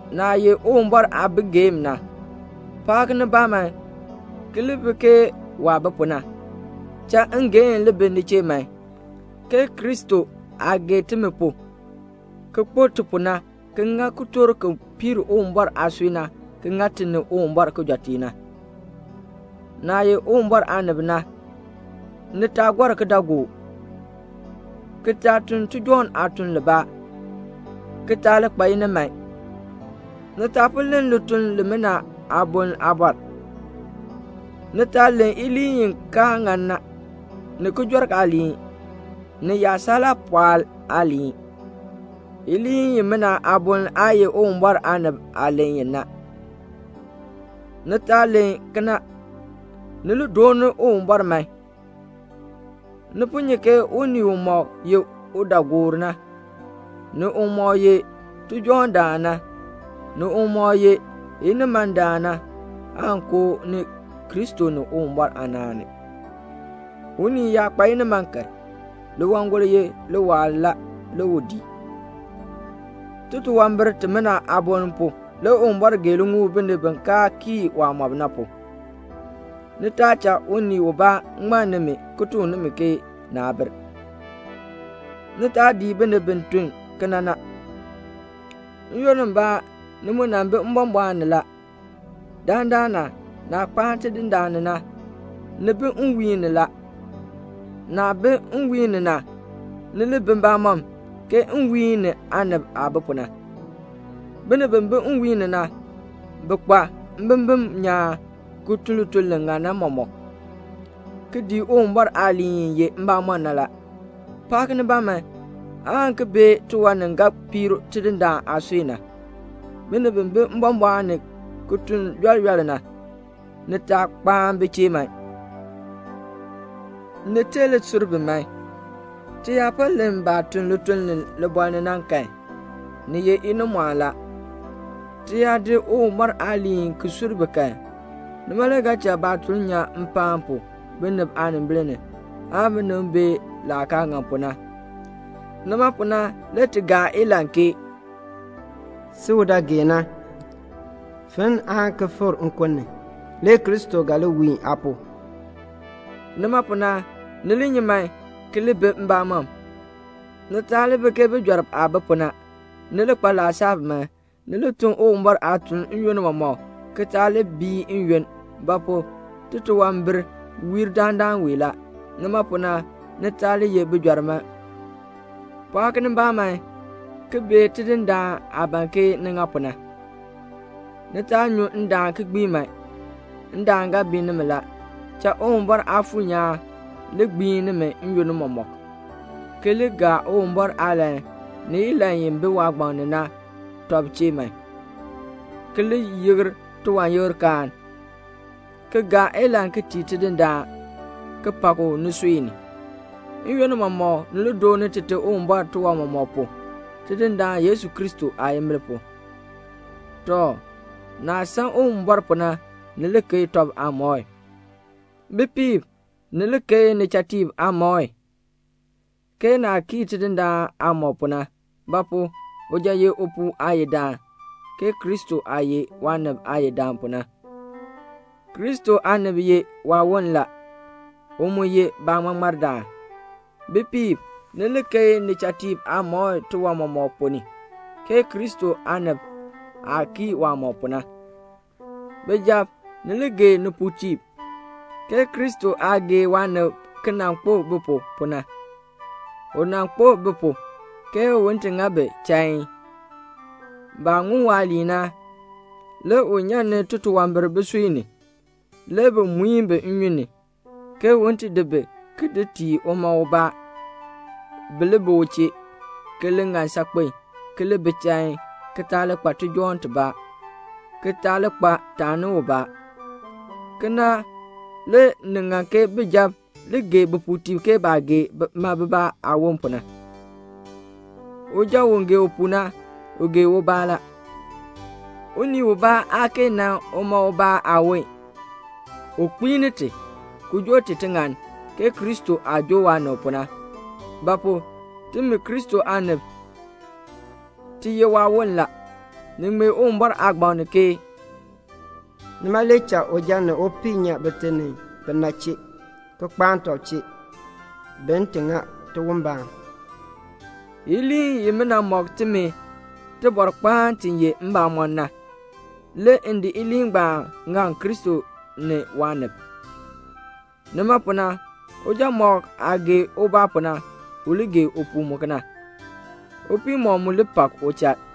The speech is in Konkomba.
Naah ye Uwumbɔr aabigeem na, pɔɔk nibaa man, ki li bi ke waah bi pu na. Cha ngeehn li bi ni chee man, ke Kristo aah gee timi pu, ki kpo ti pu na, ki ŋa kitork ki piir Uwumbɔr aasui na, ki ŋa ti ni Uwumbɔr kijɔteek na. Naah ye Uwumbɔr aanib na, ni taa gɔr kidaagook, ki taa tun tijɔŋ aatuln libaa, ki taa li kpa iniman. Ni taa po len lituln limina aaboln aabɔr. Ni taa len iliin i kaa ŋan na, ni kijɔrk aaliin, ni yaasalaapɔɔl aaliin. Iliin imina aaboln aa ye Uwumbɔr aanib aah len i na. Ni taa len kena. Ni li dooni Uwumbɔr man. Ni po nyi ke unii umɔk ye udaagoor na, ni umɔk ye tijɔŋdaan na, ni umɔk ye inimandaan na, aan koo ni Kristo ni Uwumbɔr aanaan ni. Unii yaa kpa iniman kan, liwangol ye liwaal la, le u dii. Titunwambir timina aaboln pu, le Uwumbɔr gee liŋuul binib bi kaa kii waamɔb na pu. Ni taa cha unii ubaa ŋmann nimi ki tuk nimi ke naa bir. Ni taa dii binib bi tun kena na. N-yoonn mbaa ni mu nan bi mbɔmbɔɔn ni la. Dandana, naah kpaan Tidindaan ni na, ni bi nwiihn ni la. Naah bi nwiihn ni na, ni li bi mbamɔm, ke nwiihn ni aanib aah bi pu na. Binib bi bi nwiihn ni na, bi kpa mbimbin nyaan, ki tun lituln li ŋan na mɔmɔk, ki dii Uwumbɔr aaliin i ye mbamɔn na la. Pɔɔk nibaa man, aan ki bee tiwan ni ga piir Tidindaan aasui na. Binib bi bi mbɔmbɔɔn ni ki tun yɔl yɔl na, ni taa kpaan bi chee man. Ni tee li sur bi man. Ti yaa po len baah tun lituln libɔɔl ni na kan, ni ye inimɔɔn la. Ti yaa di Uwumbɔr aaliin ki sur bi kan, nima le ga cha baatuln nyan mpaan pu binib aanimbil ni, aan binib bee laah kaa ŋan pu na. Nima pu na le ti gaa ilahn ke "Si u dɔ geen na, finn aan ki fikr nkun ni, le Kristo ga li wiin aa pu." Nima pu na, ni li nyi man, ki li bi mbamɔm. Ni taa li bi ke bijɔrb aah bi pu na. Ni li kpa laasab man. Ni li tun Uwumbɔr aatuln n-yoonn mɔmɔk, ki taa bii n-yoonn; ba pu? titunwambir wiir dandana wee la. Nima pu na, ni taa li ye bijɔrb man. Pɔɔk nibaa man ki bee Tidindaan aah ban ke ni ŋa pu na. Ni taa nyu ndaan ki gbii man. Ndaan ga bii nimi la. Cha Uwumbɔr Aafuur nyaan li gbiin nimi n-yoonn mɔmɔk, ki li gaa Uwumbɔr aalahn ni ilahn i bi waagbaŋ ni na tɔb chee man, ki li yikr tiwanyikrkaan, ki gaa ilahn ki tii Tidindaan, ki pak u nisui ni. N-yoonn mɔmɔk, ni li dooni Tite Uwumbɔr tiwan mɔmɔk pu, Tidindaan Yesu Kristo aayimbil pu. Tɔ, naah san Uwumbɔr pu na, ni li keei tɔb aamɔi. Bipiib, ni li keei nichatiib aamɔi, ke naah kii Tidindaan aamɔb pu na; ba pu? uja ye upuu aayidaan, ke Kristo aah ye waanib Aayidaan pu na. Kristo aanib ye waawon la. U mu ye baaŋmardaan. Bipiib, ni li keei nichatiib aamɔi tiwan mɔmɔk ponn ni, ke Kristo aanib aah kii waamɔb pu na. Bijab, ni li gee nipuutiib, ke Kristo aah gee waanib ki nan kpo bi pu, pu na. U nan kpo bi pu, ke un ti ŋa bi chain. Baah ŋun waaliin na, le u nyan ni titunwambir bisui ni, le bi muin bi nnyun ni, ke un ti di bi, ki di tii uma ubaa, bi li bi u chee, ki li ŋan saakpen, ki li bi chain, ki taa li kpa tijɔŋ tibaa, ki taa li kpa taani ubaa. Kena le ni ŋan ke bijab li gee bipuutiib ke baah gee bima bibaa aawon pu na. Uja u gee upuu na, u gee ubaa la. Unii ubaa aa kee nan uma ubaa aawon. U kpiini ti, ki joo ti tiŋann, ke Kristo aah joo waanib pu na; ba pu? timi Kristo aanib, ti ye waawon la. Ni ŋmee Uwumbɔr aagbaŋ ni ke: "Nima le cha uja ni upii nyan bite ni bina chee, ki kpaan tɔb chee, bin ti ŋa tiwon tibaa." Iliin imina mɔk timi tibɔrkpaan ti ye mbamɔn na, le m di iliin ngbaan ki di ŋak Kristo ni waanib. Nima pu na, uja mɔk aah gee ubaa pu na, u li gee upuu mu kena. Upii mɔk mu li pak uchal.